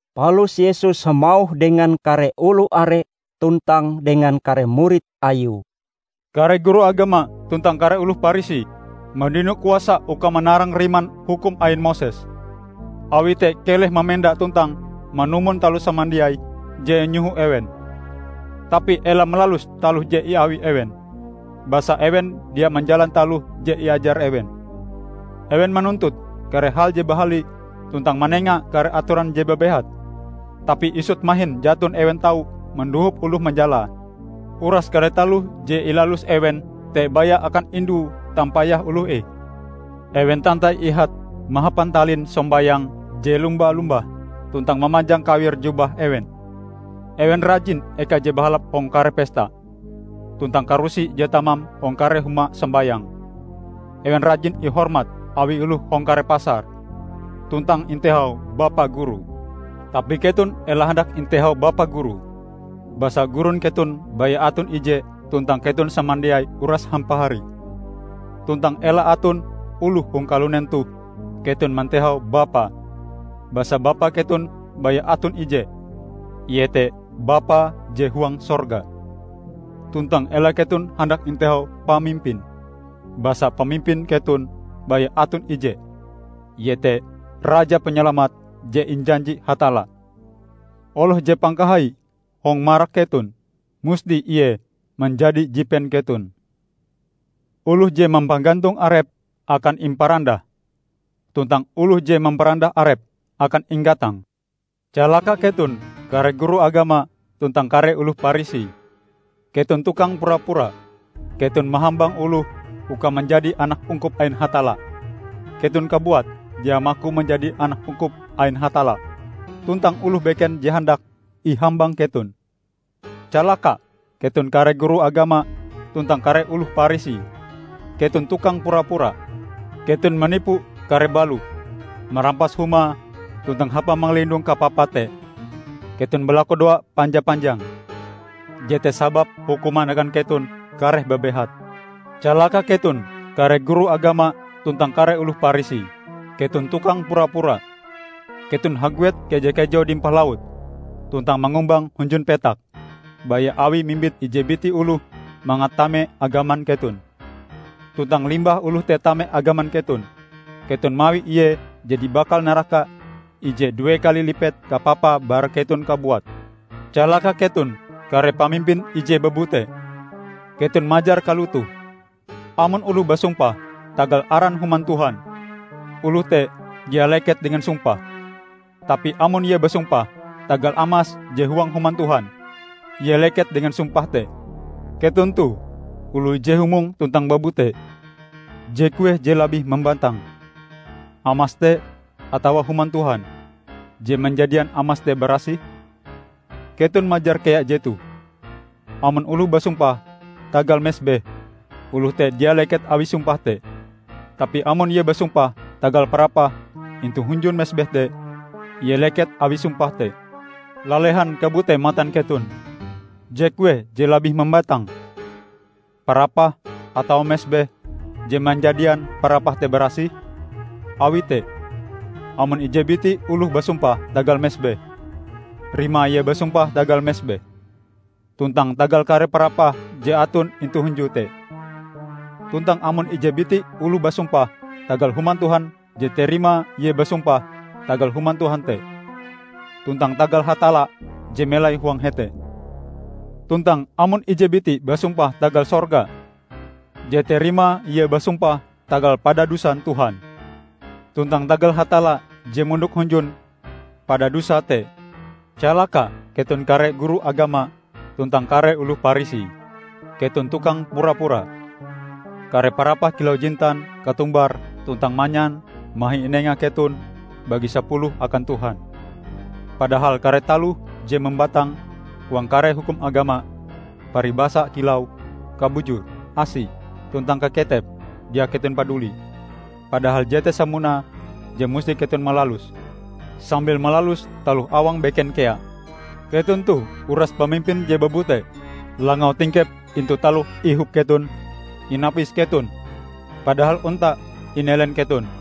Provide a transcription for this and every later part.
Palus Yesus hamauh dengan kare oloh are tuntang dengan kare murid Ayue, "Kare guru agama tuntang kare oloh Parisi mandino kuasa uka manarang riman hukum ain Moses. Awi te keleh mamenda tuntang manumon taloh samandiai je inyoho ewen. Tapi ela malalus taloh je iawi ewen, basa ewen dia manjalan taloh je iajar ewen. Ewen manuntut kare hal je bahali tuntang manenga kare atoran je babehat, tapi isut mahin jaton ewen tau mandohop oloh manjalae. Uras kare taloh je ilalus ewen te baya akan indu tampayah oloh ih. Ewen tantai ihate mahapan talin sombayang je lomba-lombah tuntang mamanjang kawir jubah ewen! Ewen rajin eka je bahalap hong kare pesta, tuntang karusi je tamam hong kare huma sombayang. Ewen rajin ihormat awi oloh hong kare pasar, tuntang intehau 'Bapa Guru'. Tapi keton ela handak intehau 'Bapa guru', basa gurun keton baya aton ije tuntang keton samandiai uras hampahari. Tuntang ela aton oloh hong kalunen toh keton mantehau 'Bapa', basa Bapa keton baya aton ije, iete Bapa je huang sorga. Tuntang ela keton handak intehau 'Pamimpin', basa pamimpin keton baya aton ije, iete Raja Panyalamat je injanji Hatalla. Oloh je pangkahaie hong marak keton, musti ie manjadi jipen keton. Oloh je mampagantong arepe akan imparandah, tuntang oloh je mamparandah arepe akan inggatang." "Calaka keton kare guru agama tuntang kare oloh Parisi! Keton tukang pura-pura. Keton mahambang oloh uka manjadi anak ungkup ain Hatalla. Keton kabuat dia maku manjadi anak ungkup ain Hatalla, tuntang oloh beken je handak, ihambang keton. [ Calaka keton kare guru agama tuntang kare oloh Parisi: Keton tukang pura-pura. Keton manipu kare balo marampas humae tuntang hapa mangalindong kapapa te keton balakudoa panja-panjang. Jete sababe hukuman akan keton kareh babehat!] Calaka keton kare guru agama tuntang kare oloh Parisi! Keton tukang pura-pura! Keton haguet keja-kejau dimpah laut, tuntang mangumbang hunjun petak baya awi mimbit ije biti oloh mangat tame agaman keton. Tuntang limbah oloh te tame agaman keton, keton mawi ie jadi bakal naraka ije due kali lipet kapapae bara keton kabuat! Calaka keton kare pamimpin ije babute! Keton majar kalotoh, 'Amon oloh basumpah tagal aran Human Tuhan, oloh te dia leket dengan sumpahe; tapi amon ie basumpah tagal amas je huang Human Tuhan, ie leket dengan sumpahe te.' Keton toh oloh ije humong tuntang babute! Je kueh je labih mambatang: amas te atawa Human Tuhan je manjadian amas te barasih? Keton majar kea jetoh, 'Amon oloh basumpah tagal mesbeh, oloh te dia leket awi sumpahe te; tapi amon ie basumpah tagal parapah intu hunjun mesbeh te, ie leket awi sumpahe te.' Lalehan kabute matan keton! Je kueh je labih mambatang? Parapah atawa mesbeh je manjadian parapah te barasih? Awi te, amon ije biti oloh basumpah tagal mesbeh, rimae ie basumpah tagal mesbeh, tuntang tagal kare parapah je aton intu hunjue te. Tuntang amon ije biti oloh basumpah tagal Human Tuhan jete rimae ie basumpah tagal Human Tuhan te, tuntang tagal Hatalla je melai huang hete. Tuntang amon ije biti basumpah tagal sorga, jete rimae ie basumpah tagal padadusan Tuhan, tuntang tagal Hatalla je mondok hunjun padadusae te. Calaka keton kare guru agama tuntang kare oloh Parisi! Keton tukang pura-pura. Kare parapah kilau jintan, katumbar tuntang manyan mahi inenga keton bagi sapuluhe akan Tuhan. Padahal kare taloh je mambatang huang kare hukum agama, paribasa kilau: Kabujur, asi, tuntang kaketep, dia keton padulie. Padahal jete sapunae je musti keton malaluse, sambil malalus taloh awang beken kea. Keton toh uras pamimpin je babute! Langau tingkep intu taloh ihop keton, inapis keton, padahal onta inelen keton!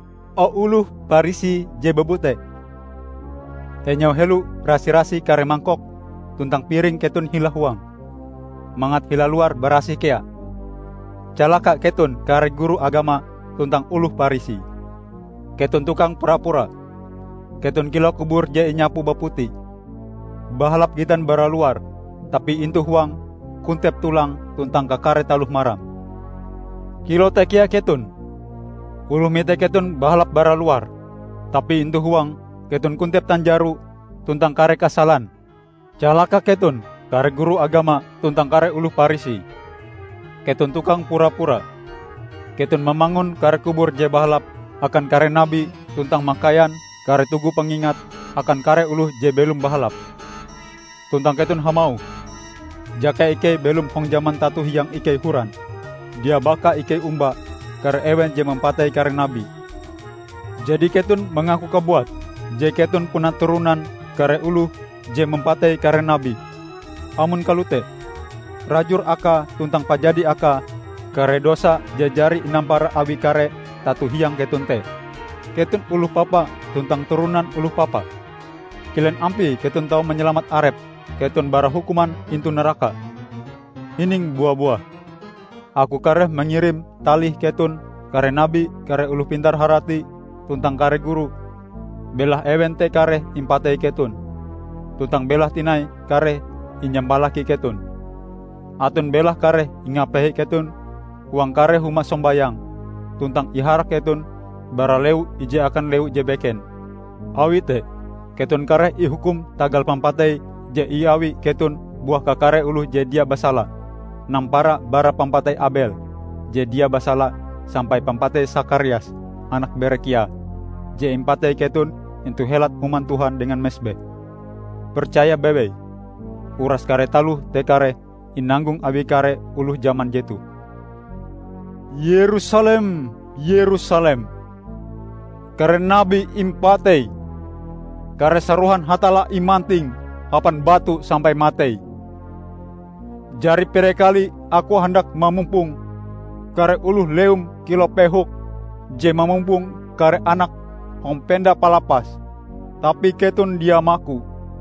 O oloh Parisi je babute! Enyau helo rasi-rasih kare mangkok tuntang piring keton hila huange, mangat hila luare barasih kea! Calaka keton kare guru agama tuntang oloh Parisi! Keton tukang pura-pura! Keton kilau kubur je inyapu baputi; bahalap gitan bara luar, tapi intu huange kontep tolang tuntang kakare taloh maram. Kilau te kea keton. Oloh mite keton bahalap bara luar; tapi intu huang, keton kontep tanjaro tuntang kare kasalan." "Calaka keton kare guru agama tuntang kare oloh Parisi! Keton tukang pura-pura! Keton mamangun kare kubur je bahalap akan kare nabi tuntang makaian kare tugu pangingat akan kare oloh je belom bahalap. Tuntang keton hamauh, 'Jaka ikei belom hong jaman tato hiang ikei horan, dia baka ikei omba kare ewen je mampatei kare nabi.' Jadi keton mangaku kabuat je keton puna turonan kare oloh je mampatei kare nabi! Amon kalote, rajur akae tuntang pajadi akae kare dosa je jari inampara awi kare tato hiang keton te! Keton oloh papa tuntang turonan oloh papa! Kilen ampie keton tau manyalamat arep keton bara hukuman intu naraka? Hining bua-buah: Aku kareh mangirim talih keton kare nabi, kare oloh pintar-harati, tuntang kare guru; belahe ewen te kareh impatei keton, tuntang belahe tinai kareh inyampalaki keton. Aton belahe kareh ingapehe keton huang kare huma sombayang, tuntang iharak keton bara lewu ije akan lewu je beken. Awi te, keton kareh ihukum tagal pampatei je iawi keton buah kakare oloh je dia basala -- nampara bara pampatei Abel je dia basala, sampai pampatei Sakarias, anak Berekhia, je impatei keton intu helat Human Tuhan dengan mesbeh. Percaya bewei: uras kare taloh te kareh inanggong awi kare oloh jaman jetoh!" "Yerusalem, Yerusalem! Kare nabi impateim. Kare sarohan Hatalla imantingm hapan batu sampai matei. Jari pire kali Aku handak mamumpong kare oloh lewum kilau pehok je mamumpong kare anake hong penda palapase, tapi keton dia maku!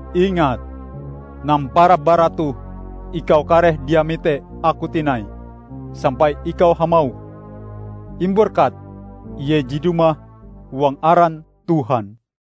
Ingat: Nampara bara toh ikau kareh dia mite Aku tinai sampai ikau hamauh, 'Imberkat Ie je dumah huang aran Tuhan.' "